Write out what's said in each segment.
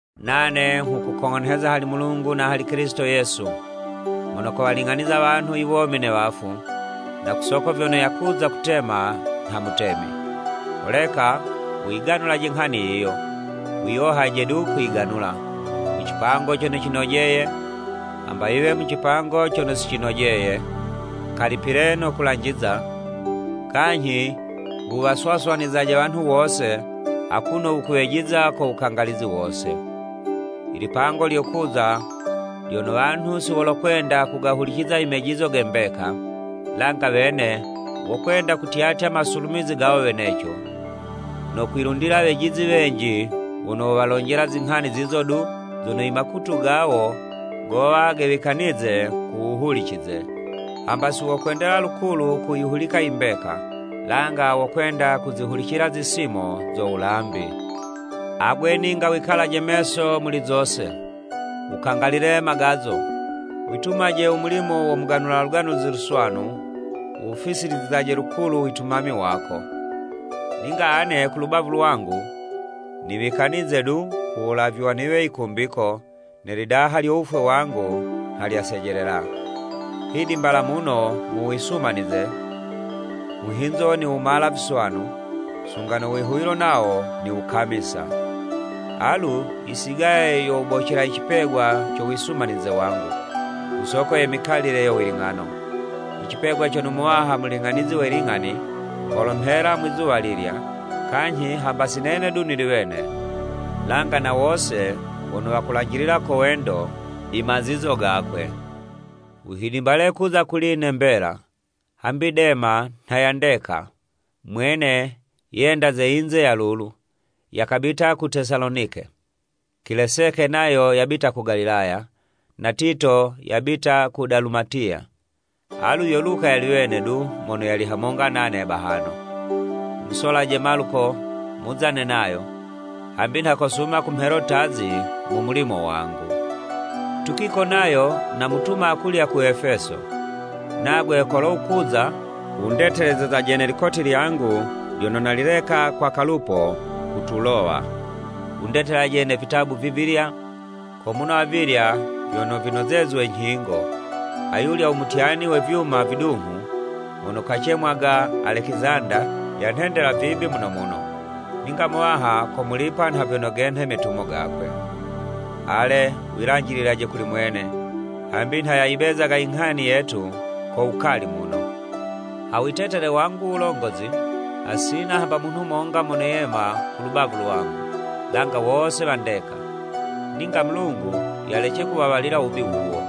Nane nghukukong'onheza hali Mulungu na hali Kilisito Yesu, mono kowaling'aniza wanhu i womi ne wafu, na ku soko vyono yakuza kutema nha Mutemi, holeka wuyiganulaje nghani yiyo, wiyohaje du kuyiganula (mu cipango cono cinojeye, hamba yiwe mu cipango cono si cinojeye), kalipile no kulanjiza, kanyhi wuwaswaswanizaje wanhu wose, akuno wukuwejiza ko wukangalizi wose. I lipango lyokuza lyono wanhu si wolokwenda kugahuliciza i mejizo ge mbeka, langa wene wokwenda kutyatya masulumizi gawo weneco, no kwilundila wejizi wenji wono wowalonjela zinghani zizo du zono i makutu gawo gowa gewikanize kuwuhulicize. Hamba si wokwendela lukulu kuyihulika imbeka, langa wokwenda kuzihulicila zisimo zo wulambi. Agwe, ninga wikalaje meso muli zose, wukangalile magazo, witumaje u mulimo wo muganula Luganuzi Luswanu, wuwufisilizizaje lukulu u witumami wako. Ninga ane ku lubavu lwangu, niwikanize du, ku wulavywa niwe yikumbiko, ne lidaha lyo wufwe wangu nha lyasejelela. Hidimbala muno mu wisumanize, muhinzo niwumala viswanu, sunga no wihuwilo nawo niwukamisa. Alu yisigaye yo wubocela i cipegwa co wisumanize wangu, ku soko ye mikalile yo wiling'ano, i cipegwa cono Muwaha Muling'anizi we ling'ani, kolomhela Mwizuwa lilya, kanyhi hamba si nene du nili wene, langa na wose wono wakulanjilila ko wendo i mazizo gakwe. Wuhidimbale kuza kuli'ne mbela. Hambi Dema nha yandeka, mwene yenda ze yinze ya lulu, yakabita ku Tesalonike. Kileseke nayo yabita ku Galatiya, na Tito yabita ku Dalumatiya. Alu yo Luka yali wene du mono yali hamonga nane bahano. Wumusolaje Maluko muzane nayo, hambi nha kosuma kumhelo'tazi mu mulimo wangu. Tukiko nayo, namutuma akulya ku Efeso. Nagwe kolo wukuza, wundetelezezaje ne likoti lyangu lyono nalileka kwa Kalupo ku Tulowa, wundetelaje ne vitabu vivilya, ko muno avilya vyono vinozezwe nyhingo. Ayulya u mutyani we vyuma vidunghu, mono kacemwaga Alekizanda, yanhendela vibi muno muno, ningo Muwaha komulipa nha vyono genhe metumo gakwe. Ale, wilanjililaje kuli mwene, hambi nha yayibezaga inghani yetu ko wukali muno. Ha witetele wangu wulongozi, hasina hamba munhu monga mono yema ku lubavu lwangu, langa wose wandeka. Ninga Mulungu yalece kuwawalila wubi wawo!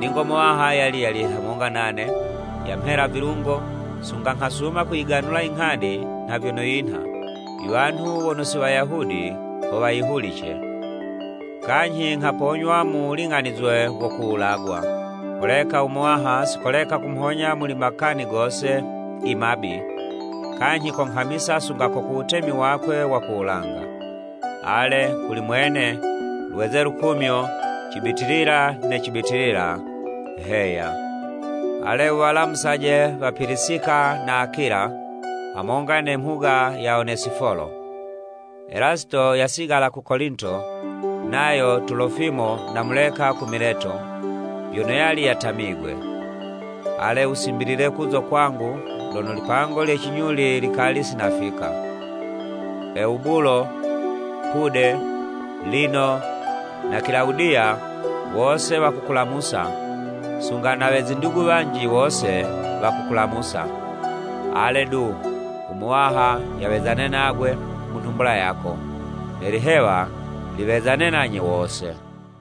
Ningo Muwaha yali yali hamonga nane, yamhela vilungo, sunga nghasuma kuyiganula inghani nha vyono yinha, i wanhu wono si Wayahudi ho wayihulice, kanyhi nghaponywa mu waling'anizwe wo kuwulagwa. Holeka u Muwaha si koleka kumhonya muli makani gose i mabi, kanyhi konghamisa sunga ko ku wutemi wakwe wa ku wulanga. Ale, kuli Mwene, lweze lukumyo cibitilila ne cibitilila! Heya. Ale, wuwalamusaje wa Pilisika na Akila, hamonga ne mhuga ya Onesifolo. Elasito yasigala ku Kolinto, nayo Tulofimo namuleka ku Mileto, vyono yali yatamigwe. Ale, wusimbilile kuzo kwangu lono lipango lye cinyuli likali sinafika. Ewubulo, Pude, Lino, na Kilawudiya wose wakukulamusa, sunga na we zindugu wanji, wose wakukulamusa. Ale, du, u Muwaha yawezane nagwe mu nhumbula yako. Ne lihewa liwezane nanye wose.